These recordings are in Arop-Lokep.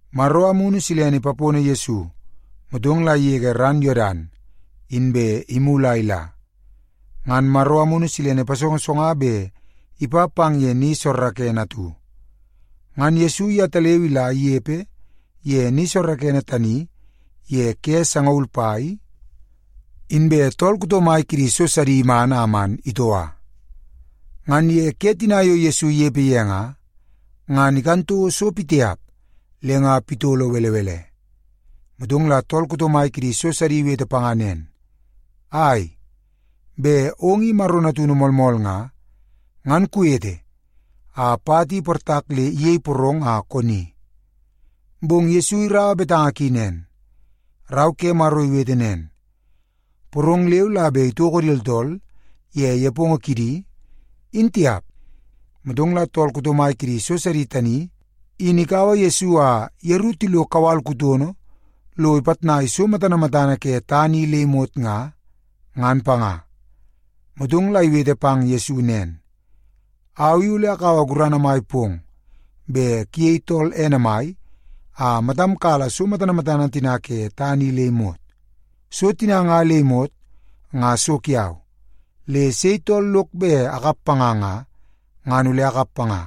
Maro Amunu Silene ipapono Yesu, motong la igege ran Yodan, inbe imulu a ila. Ngan Maro Amunu Silene ipasongosonga bet ipa pang ye ni soorookoonoo atu. Ngan Yesu yetaleu ila inepe ye ni soorookoonoo tani ye ke sangaul pai, inbe tool kuto mai kidi so sidi iman a man itoua. Ngan ye ke tina yo Yesu inepe ye nga, ngan ikan toko so pitiap le nga pitolo belebele. Motong la tool kuto mai kidi so sidi iwete panga nen, “Ai, bet ong i Maro natunu moolmool nga, ngan kuwete a pat i iportak le iyei porong a koni.” Bong Yesu iraua betanga ki nen, “Rau ke Maro iwete nen, ‘Porong leu la bet itoko di tooltool ye nepongo kidi, in tiap.’” Motong la tool kuto mai kidi so sidi tani in ikaua Yesu a yeru tilo kawal kutono lo ipitnai so matana matana ke tana i le imot nga, ngan panga. Motong la iwete pang Yesu nen, “Au i ole akaua gurana mai pong bet kuyei tool ene mai a matam kala so matana matana tina ke tana i le imot. So tina nga le imot, nga so kiau. Le sei tool lok bet akap panga nga, ngan ole akap panga.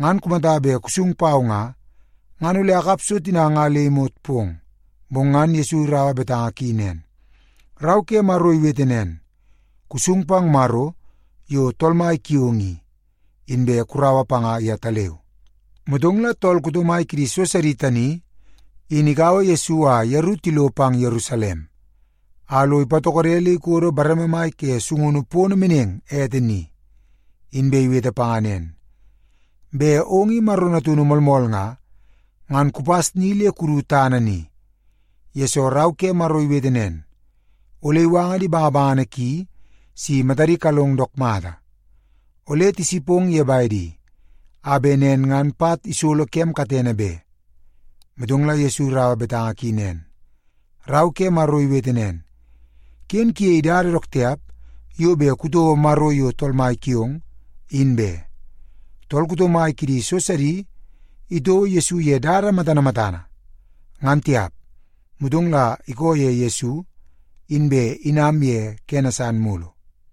Ngan kumata bet kusung pau nga, ngan ole akap so tina nga le imot pong.” Bong ngan Yesu iraua betanga ki nen, “Rau ke Maro iwete nen, ‘Kusung pang Maro yo Tool Mai kiong i, inbe kuraua panga yetaleu.’” Motong la tool kuto mai kidi so sidi tani in ikaua Yesu a yeru tilo pang Yerusalem, a lo ipatokode le ikodo bareme mai ke sungunu pono meneng ete ni, inbe iwete panga nen, “Bet ong i Maro natunu moolmool nga, ngan kupas ni le kudu tana ni, yesoo Rau ke Maro iwete nen, ‘Ole iwanga di bangabangana ki si matadi kalong dook mata. Ole tisipong ye bedi, a bet nen ngan pat isolo kem katene be.’” Motong la Yesu iraua betanga ki nen, “Rau ke Maro iwete nen, ‘Ken kuyei dada dook tiap yo bet kutouo Maro yo Tool Mai kiong, in be.’” Tool kuto mai kidi so sidi itouo Yesu ye dada matana matana, ngan tiap. Motong la ikoo ye Yesu, inbe inam ye kene san mulu.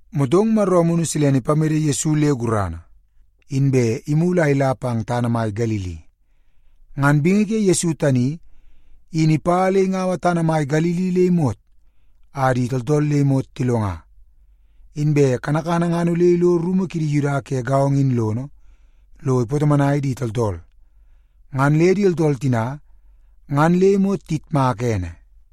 Motong Maro Amunu Silene ipamede Yesu le gurana, inbe imulu a ila pang tana mai Galili. Ngan bingi ke Yesu tani in ipa le ingaua tana mai Galili le imot a di tooltool le imot tilonga. Inbe kanakana ngan ole ilo rumu kidi Yuda ke gaongo in lono, lo ipatomonai di tooltool. Ngan le di tooltool tina ngan le imot tiyitmaka ene.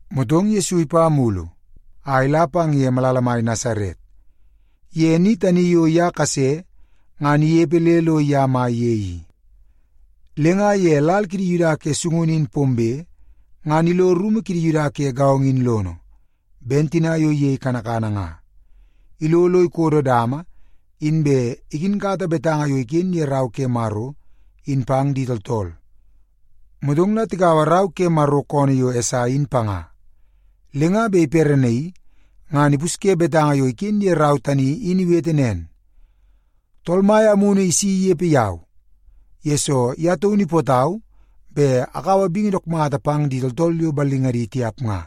Motong Yesu ipa mulu a ila pang ye malala mai Nasaret, ye ni tani yo ye kase ngan inepe le lo ye mai ye i. Le nga ye lal kidi Yuda ke sungunu in pombe, ngan ilo rumu kidi Yuda ke gaongo in lono, ben tina yo iyei kanakana nga. Ilo lo ikodo dama, inbe ikinkata betanga yo iken ye Rau ke Maro in pang di tooltool. Motong la tikaua rau ke Maro koonoo yo Esai in panga. Le nga bet iperenaii ngan ipusye betanga yo iken ye rau tani in iwete nen, “Tool Mai Amunu si inepe yau, yesoo ye taunu ipootau bet akaua bingi dook mata pang di tooltool yo ballingadi tiap nga.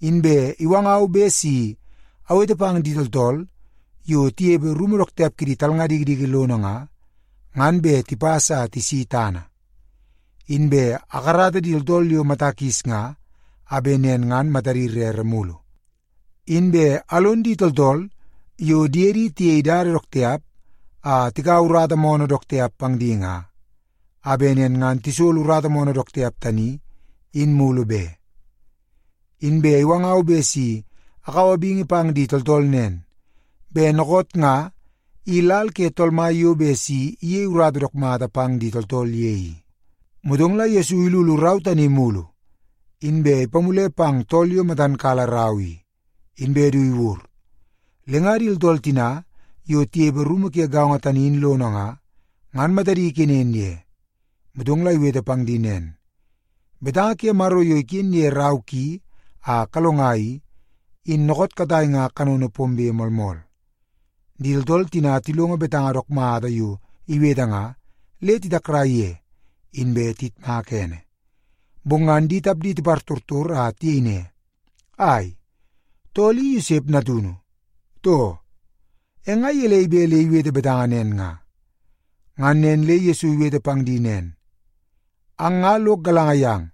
Inbe iwangau bet si awete pang di tooltool yo tinepe rumu dook tiap kidi talnga dikidiki lono nga, ngan bet tipas a tisi tana; inbe akarata di tooltool mata kis nga, a bet nen ngan matadi rere mulu; inbe alon di tooltool yo diedi tiyei di dook tiap a tikaua urata moonoo dook tiap pang di nga, a bet nen ngan tisolo urata moonoo dook tiap tani in mulu be. Inbe iwangau bet si akaua bingi pang di tooltool nen, bet dookoot nga i lal ke Tool Mai yo bet si iyei urata dook mata pang di tooltool ye i.” Motong la Yesu ilulu rau tani mulu, inbe ipamule pang tool yo matan kala rau i, inbe du iwur. Le nga di tooltool tina yo tinepe rumu ke gaongo tani in lono nga, ngan matadi kenen ye. Motong la iwete pang di nen, “Betanga ke Maro yo iken ye rau ki a kalonga i, in dookoot katai nga kanono pombe moolmool.” Di tooltool tina tilongo betanga dook mata yo iwete nga, le titakrai ye, inbe tiyitmaka ene. Bong ngan di tapdi tipartortor a tiyei ne, “Ai, tool i Yosep natunu, too? E nga gelei bet le iwete betanga nen nga?” Ngan nen le Yesu iwete pang di nen, “Ang nga lok galanga yang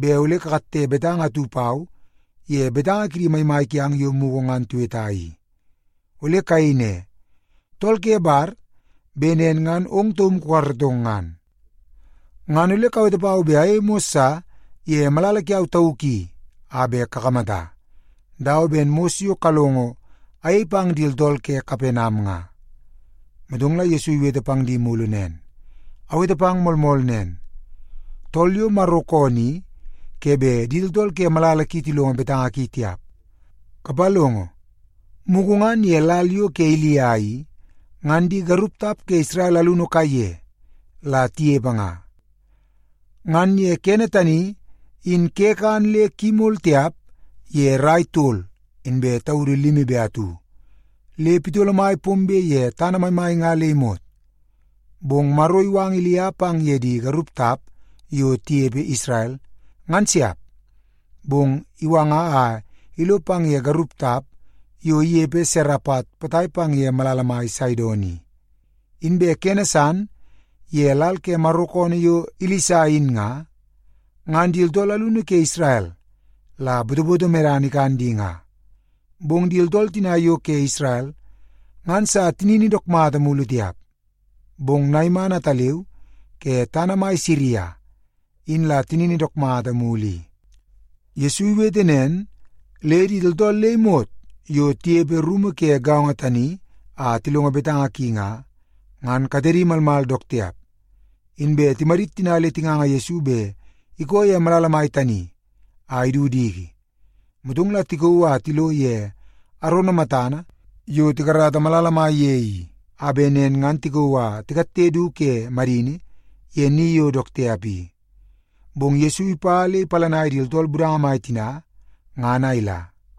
bet ole kakatte betanga atu pau ye betanga kidi maimai kiang yo mugu ngan tiweta i. Ole kayei ne, ‘Tool ke bar bet nen ngan ong taum kukaratong ngan.’ Ngan ole kawete pau bet ayei mos sa ye malala kiau tauk i a bet kakamata, dawa ben mos yo kalongo ayei pang di tooltool ke Kapenam nga.” Motong la Yesu iwete pang di mulu nen, “Awete pang moolmool nen, tool yo Maro koonoo i ke bet di tooltool ke malala ki tilongo betanga ki tiap. Kapalongo, mugu ngan ye lal yo ke Ilia i, ngan di garup tap ke Isrel alunu kaiye la tinepe nga. Ngan ye kene tani, in ke kan le ki imol tiap ye rai tol inbe taudu limi be atu, le pitolo mai pombe ye tana maimai nga le imot. Bong Maro iwanga Ilia pang ye di garup tap yo tinepe Isrel, ngan siap. Bong iwanga a ilo pang ye garup tap yo inepe Serepat potai pang ye malala mai Saidon i. Inbe kene san, ye lal ke Maro koonoo yo Ilisa in nga, ngan di tooltool alunu ke Isrel la botoboto medana in ikan di nga. Bong di tooltool tina yo ke Isrel ngan sa tinini dook mata mulu tiap. Bong Naiman ataleu ke tana mai san Siria in la tinini dook mata mulu i.” Yesu iwete nen le di tooltool le imot yo tinepe rumu ke gaongo tani a tilongo betanga ki nga, ngan katedi malmal dook tiap. Inbe timadit tina le tinganga Yesu bet ikoo ye malala mai tani a idu diki. Motong la tikauu a tilo ye arono matana yo tikarata malala mai ye i, a bet nen ngan tikauu a tikatte du ke madini ye ni yo dook tiap i. Bong Yesu ipa le ipalanai di tooltool budanga mai tina ngan a ila.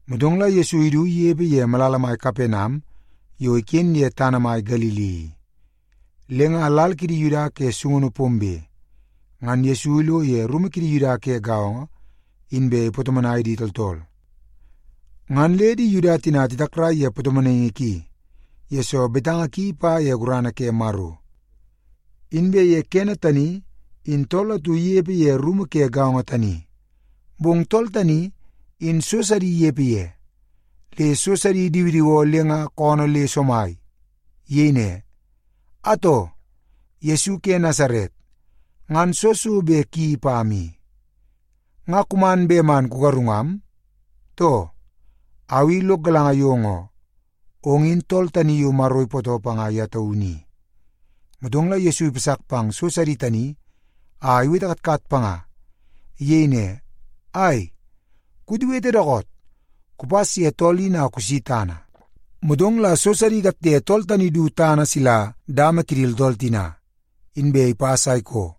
Motong la Yesu idu inepe ye malala mai Kapenam yo iken ye tana mai Galili i. Le nga lal kidi Yuda ke sungunu pombe, ngan Yesu ilo ye rumu kidi Yuda ke gaongo, inbe ipatomonai di tooltool. Ngan le di Yuda tina titakrai ye patomonaingi ki, yesoo betanga ki ipa ye gurana ke Maro. Inbe ye kene tani, in tool atu inepe ye rumu ke gaongo tani, bong tool tani in so sidi inepe ye. Le so sidi idiwidiwoo le nga koonoo le somai. Iyei ne, “Atoo! Yesu ke Nasaret, ngan soo so bet kuyeii pam i? Nga kuman bet man kugarungam, too? Au i lok galanga yong oo, ong in Tool Tani Yo Maro Ipootoo Panga Ye Taunu I.” Motong la Yesu ipasak pang so sidi tani a iwete katkat panga. Iyei ne, “Ai, kuwetewete dookoot! Kupas ye tool in a kusi tana!” Motong la so sidi ikatte tool tani du tana sila dama kidi tooltool tina, inbe ipas a ikoo,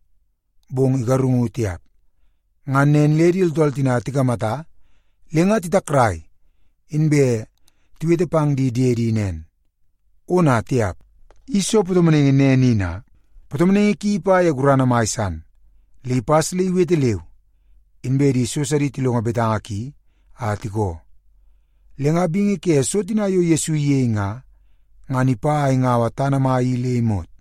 bong igarungu tiap. Ngan nen le di tooltool tina tikamata le nga titakrai, inbe tiwete pang di diedi nen, “Ona tiap! I soo patomonaingi nen i na? Patomonaingi ki ipa ye gurana mai san, le ipas le iwete leu, inbe di so sidi tilongo betanga ki a tikoo!” Le nga bingi ke so tina yo Yesu iyei nga, ngan ipa a ingaua tana mai i le imot.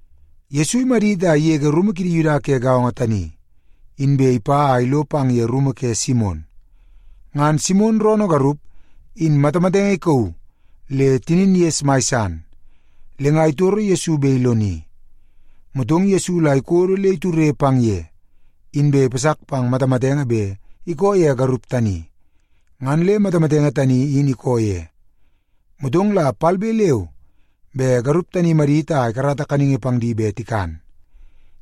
Yesu imadit a igege rumu kidi Yuda ke gaongo tani, inbe ipa a ilo pang ye rumu ke Simon. Ngan Simon roonoo garup in matamatenge ikauu le tinin ges mai san. Le nga titoro Yesu bet iloni. Motong Yesu la ikodo le iture pang ye, inbe ipasak pang matamatenge bet ikoo ye garup tani, ngan le matamatenge tani in ikoo ye. Motong la palbe leu be garup tani imadit a ikarata kaningi pang di bet tikan.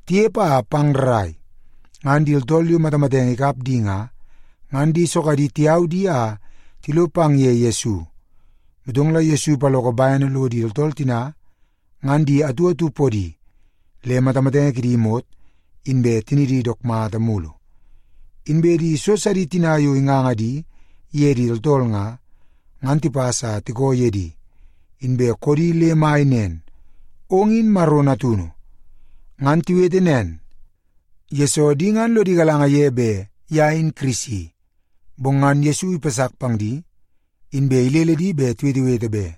Tinepe a pang rrai, ngan di tooltool yo matamatenge mai ikap di nga, ngan di sogadi tiyau di a tilo pang ye Yesu. Motong la Yesu ipaloko bene lo di tooltool tina ngan di atu atu podi, le matamatenge kidi imot inbe tinidi dook mata mulu. Inbe di so sidi tina yo inganga di ye di tooltool nga, ngan tipas a tikoo ye di, inbe koodi le mai nen, “Ong in Maro natunu!” Ngan tiwete nen, yesoo di ngan lodi galanga ye bet ye in Kirisi. Bong ngan Yesu ipasak pang di, inbe ilele di bet tiwetewete be.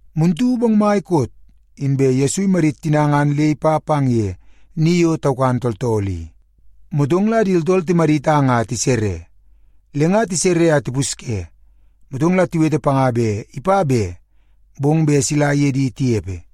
Muntu bongmai koot, inbe Yesu imadit tina ngan le ipa pang ye ni yo taukan tooltool i. Motong la di tooltool timadit a nga tisere. Le nga tisere a tipusye, motong la tiwete panga bet ipa be, bong bet sila iye di tinepe.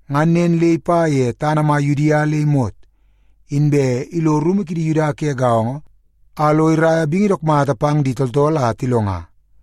Ngan nen le ipa ye tana mai Yudia le imot, inbe ilo rumu kidi Yuda ke gaongo a lo iraia bingi dook mata pang di tooltool a tilonga.